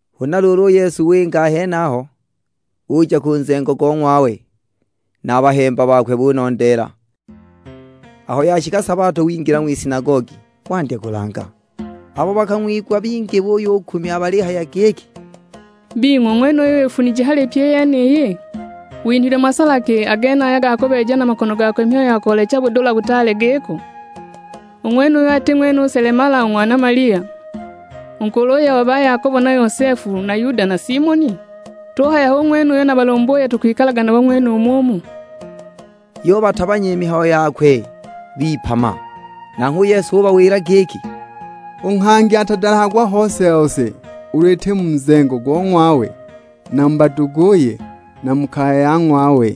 Huna luulu u Yesu winga a henaho, uja ku nzengo go ng'wawe, na a bahemba bakwe bunondeela. Aho yashika sabato wingila ng'wisinagogi, wandya kulanga. Abo bakang'wigwa bingi buyukumya balihaya giki, "Bing'we u ng'wenuyu wifunije hali pyi i yeniyi? Winhilwe masala ki a genaya ga kubeeja na makono gakwe mihayo ya koolecha budula butaale giko? U ng'wenuyu ati ng'wene u selemala u ng'wana Malia, u nkuluye o ba Yakobo na Yosefu na Yuda na Simoni? Tuhaya hu ng'wene uyo na balumbuye tukwikalaga nabo ng'wenumu umu!" Yubatabanya i mihayo yakwe, bipama! Nanghwe u Yesu ubawila giki, "U nghangi atadalahagwa hose-hose ulu iti mu nzengo go ng'wawe na mu baduguye, na mu kaya ya ng'wawe!"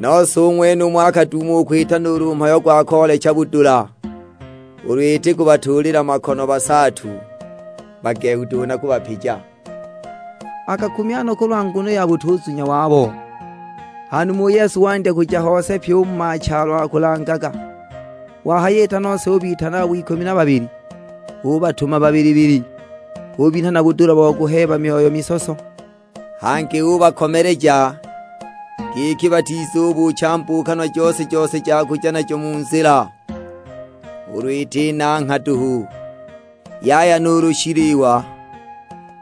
Nose u ng'wenumo akaduuma u kwita nuulu mhayo gwa koolecha budula, ulu iti kubatuulila makono basaatu bagehu duhu na kubapija. Akakumya no kulwa nguno ya butuzunya wabo! Ha numa u Yesu wandya kuja hose pyi u mu machalo akulangaga. Wahayita nose ubitana abo ikumi na babili, ubatuma babili-babili, ubinha na budula bo kuheeba myoyo misoso. Hangi ubakomeleja, giki batizubuucha mbuukanwa jose-jose ja kuja najo mu nzila, ulu iti nangha duhu. Yaya nuulu shiliwa,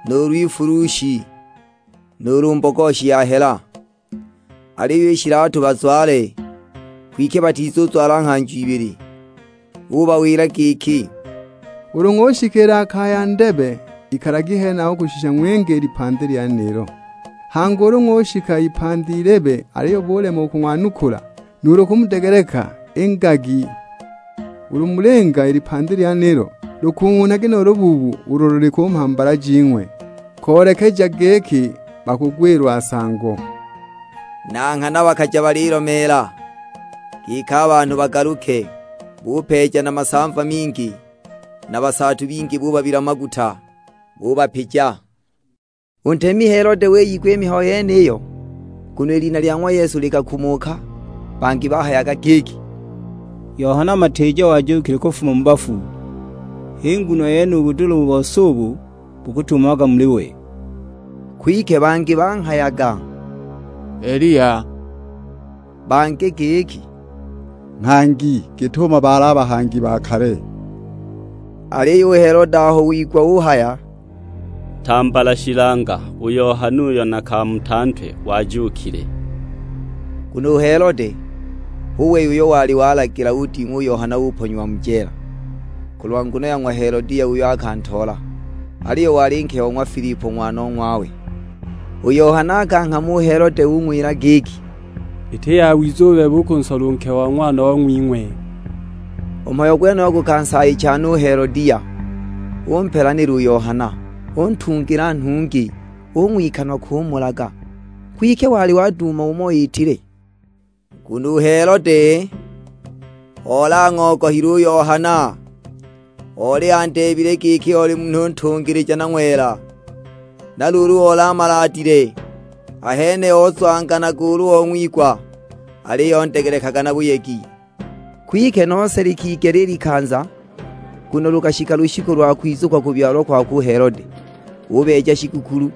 nuulu ifulushi, nuulu mbogoshi ya hela. Aliyo i shilatu bazwale, kwike batizuzwala nghanjo ibili. Ubawila giki, "Ulu ng'ushikila ha kaya ndebe, ikalagi henaho kushisha ng'winge i lipandi lyenilo. Hangi ulu ng'ushika ipandi ilebe aliyo bulema u kung'wanukula nuulu kumudegeleka, ingagi. Ulu mulinga i lipandi lyenilo, lukung'unhagi nu lubuubu ulo luli ku mhambala jing'we, koolekeja giki bakugwilwa nsango." Na nghana bakaja balilomeela, giki a banhu bagaluke. Bupeeja na masamva mingi, na basaatu bingi bubabila maguta, bubapija. U ntemi Helode wiyigwa i mihayo yeniyo, nguno i lina lya ng'wa Yesu likakumuka. Bangi bahayaga giki, "Yohana Matiija wajuukile kufuma mu bafu, h'i nguno yene u budula u bose ubu bukutumamaga muli we." Kwike bangi banghayaga, "Eliya." Bangi giki, "Nghangi, git'umo baali a bahangi ba kale." Aliyo u Helode aho wigwa uhaya, "Tambala shilanga u Yohana uyo nakamuta ntwe wajuukile!" Nguno u Helode, hu wei uyo wali walagila uding'wa u Yohana uponyiwa mu jeela, kulwa nguno ya ng'wa Helodia uyo akantoola, aliyo wali nke o ng'wa Filipo ng'wanong'wawe. U Yohana akanghama u Helode ung'wila giki, "Iti yawiza u bebe u kunsola u nke o ng'wanong'wing'we!" U mhayo gwenuyo gukansaayicha no u Helodia, umpelanila u Yohana, untungila nhungi; ung'wikanwa kumulaga. Kwike wali waduuma umo iitile. Nguno u Helode oli ang'ogohile u Yohana, oli andeebile giki oli munhu ntungilija na ng'wela, na luulu oli amaladile. Ahene ozwanganaga ulu ong'wigwa, aliyo ondegelekaga na buyegi. Kwike nose likigela i likanza, nguno lukashika lushiku lwa kwizukwa kubyalwa kwakwe u Helode. Ubeeja shigukulu,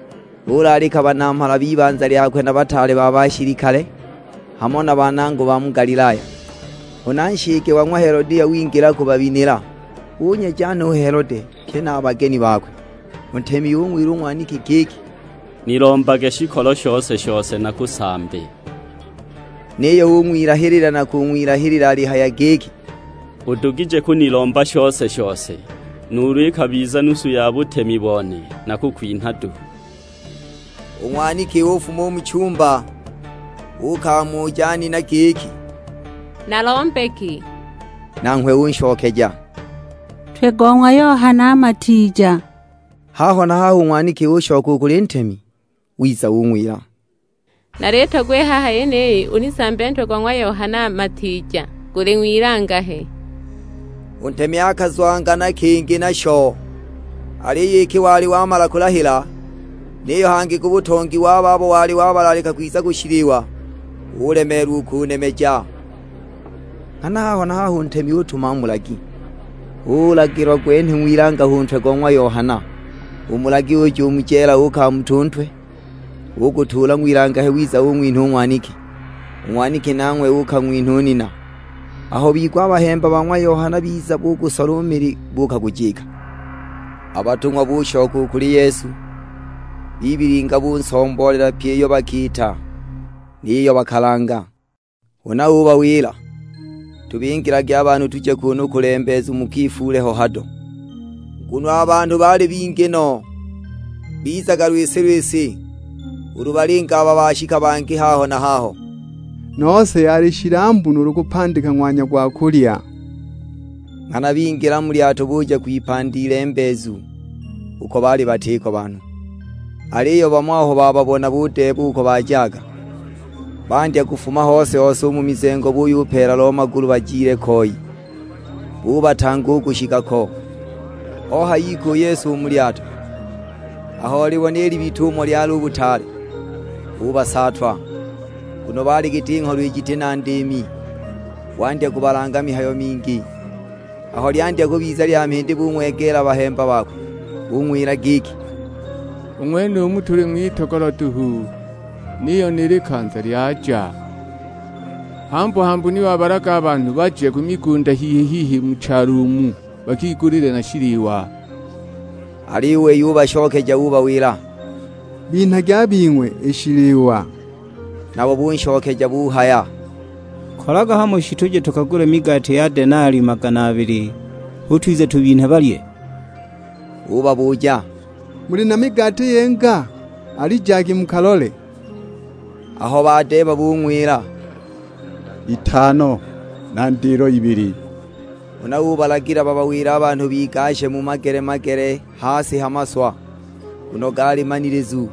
ulaalika banamhala b'ibanza lyakwe na bataale ba bashilikale, hamo na banangwa ba mu Galilaya. Huna nshike wa ng'wa Helodia wingila kubabinila, unyeja no u Helode, pye na a bageni bakwe. U ntemi ung'wila u ng'waniki giki, "Nilombage shikolo shose-shose nakusambe!" Niyo ung'wilahilila na kung'wilahilila alihaya giki, "Udugije kunilomba shose-shose, nuulu ikabiza nusu ya butemi bone nakukwinha duhu!" U ng'waniki ufuma u mu chumba, uukamuja nina giki, "Nalombe ki?" Nanghwe unshokeja, "Ntwe go ng'wa Yohana Matiija!" Haho na haho u ng'waniki ushoka u kuli ntemi; wiza ung'wila, "Nalitogwa i haha yeniyi unisambe ntwe go ng'wa Yohana Matiija, guli ng'wilangahe!" U ntemi akazwangana kingi nasho, aliyo iki wali wamala kulahila, niyo hangi ku butongi wa babo wali wabalaalika kwiza ku shiliwa, ulemeelwa u kunemeja. Nghana haho na haho u ntemi utuma mulagi, ulagila gwenhwe ng'wilangahe u ntwe go ng'wa Yohana; u mulagi uja u mu jeela uukamuta u ntwe. Ugutuula ng'wilangahe wiza ung'winha u ng'waniki, u ng'waniki nanghwe uukang'winha nina! Aho bigwa a bahemba ba ng'wa Yohana biza bugusola u mili, buukagujika! A batung'wa bushoka u kuli Yesu, bibilinga bunsomboolela pyi iyo bakiita, ni yiyo bakalanga. Huna ubawila, "ubingilagi a banhu tuje kuunu kulembeezu mukifuule ho hado." Nguno a banhu baali bingi no, bizaga lwisi-lwisi; ulu balinga aba bashika bangi haho na haho. Nose yali shilambu nuulu kupandika ng'wanya gwa kulya. Nghana bingila mu lyato buja kwipandi ilembeezu, uko baali batiko banhu. Aliyo bamo aho bababona budeeba uko bajaga, bandya kufuma hose-hose u mu mizengo buyupeela lo magulu bajile koi, bubatanga u kushika ko. Ohayika u Yesu u mu lyato, aho olibona i libita umo lyali u butaale, ubasaatwa. Nguno baali giti ngholo jiti na ndiimi, wandya kubalanga mihayo mingi. Aho lyandya kubiza lya mhindi bung'wegeela a bahemba bakwe, bung'wila giki, "U ng'wenumu tuli ng'witogolo duhu, niyo ni likanza lyaja. Hambu-hambu ni wabalaga a banhu baje ku migunda hihi-hihi mu chalo umu bakigulile na shiliwa!" Aliyo u wei ubashokeja ubawila, "Binhagi a bing'we i shiliwa." Nabo bunshokeja buhaya, "Kolaga hamo shi tuje tukagule migati ya denali magana abili hu twize tubinhe balye?" Ubabuja, "Muli na migati yinga? Alijagi mukalole!" Aho badeeba bung'wila, "Itano na ndilo ibili." Huna ubalagila babawile a banhu bigashe mu magele-magele ha si ha maswa, nguno gaali manilizu.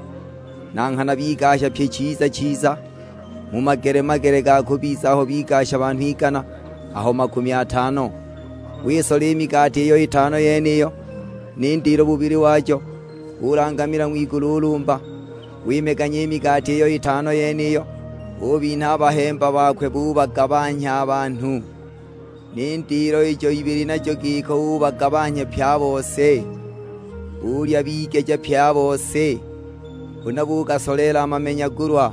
Na nghana bigasha pyi chiza-chiza, mu magele-magele ga kubiza aho bigasha banhu igana, aho makumi atano. Wisola i migati iyo itano yeniyo, ni ndilo bubili wajo. Ulangamila ng'wigulu ulumba, wimeganya i migati iyo itano yeniyo, ubinha a bahemba bakwe bubagabanhya a banhu. Ni ndilo ijo ibili najo giko, ubagabanhya pye a bose. Bulya bigeja pye a bose. Huna bugasoleela a mamenyagulwa,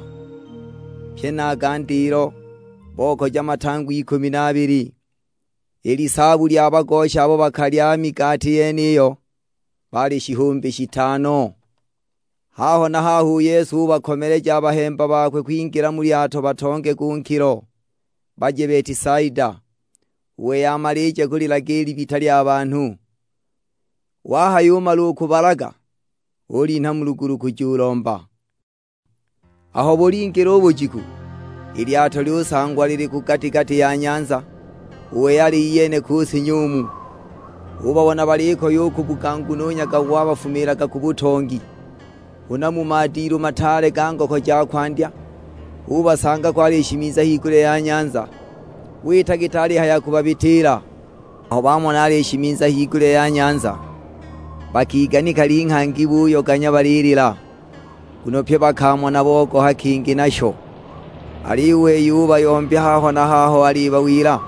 pye na a ga ndilo, bokaja matangwa ikumi na abili. I lisaabu lya bagosha abo bakalya i migati yeniyo baali shihumbi shitano. Haho na haho u Yesu ubakomeleja a bahemba bakwe kwingila mu lyato batonge ku nkilo, baje Betisaida; u wei amalije kulilaga i libita lya banhu. Wahayumala u kubalaga, ulinha mu lugulu kujulomba. Aho bulingila u bujiku, i lyato lyusangwa lili ku gati-gati ya nyanza, u wei ali iyene ku si nyumu. Ubabona balikoya u kubuga nguno u nyaga gwabafumiilaga ku butongi. Huna mu madilu mataale ga ngoko ja kwandya, ubasanga ko alishimiza higulya ya nyanza. Wita giti alihaya kubabitiila; aho bamona alishimiza higulya ya nyanza, bakiganika linghangi buyoganya balilila. Nguno pye bakamona bogoha kingi nasho! Aliyo u wei ubayombya haho na haho alibawila,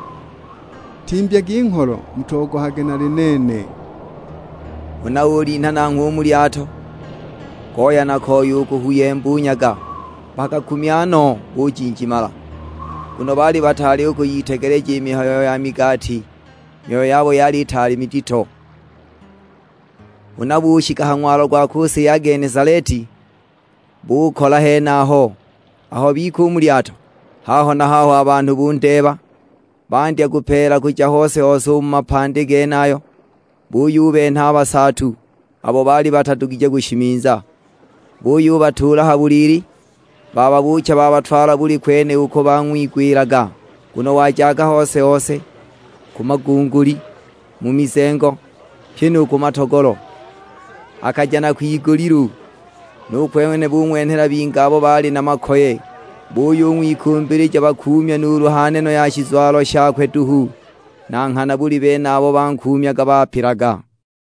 "Timbyagi ngholo, mutogohage nali nene." Huna ulinha nanghwe u mu lyato, goya na koya u kuhuuyemba u nyaga. Bakakumya no bujinjimala, nguno baali bataali u kuyitegeleja i mihayo ya migati. I myoyo yabo yali itaali midito. Huna bushika ha ng'walo gwa ku si ya Genesaleti, bukola henaho. Aho bika u mu lyato haho na haho a banhu bundeeba. Bandya kupeela kuja hose-hose u mu mapandi genayo; buyubenha a basaatu, abo baali batadugije kushimiza, buyubatuula ha buliili bababuucha babatwala buli kwene uko bang'wigwilaga. Nguno wajaga hose-hose: ku magunguli, mu mizengo, pyi nu ku matogolo. Akaja na kwigulilu, nu kwene bung'wenhela bingi abo baali na makoye, buyung'wikumbilija bakuumye nuulu ha neno ya shizwalo shakwe duhu. Na nghana buli bene abo bankuumyaga bapilaga.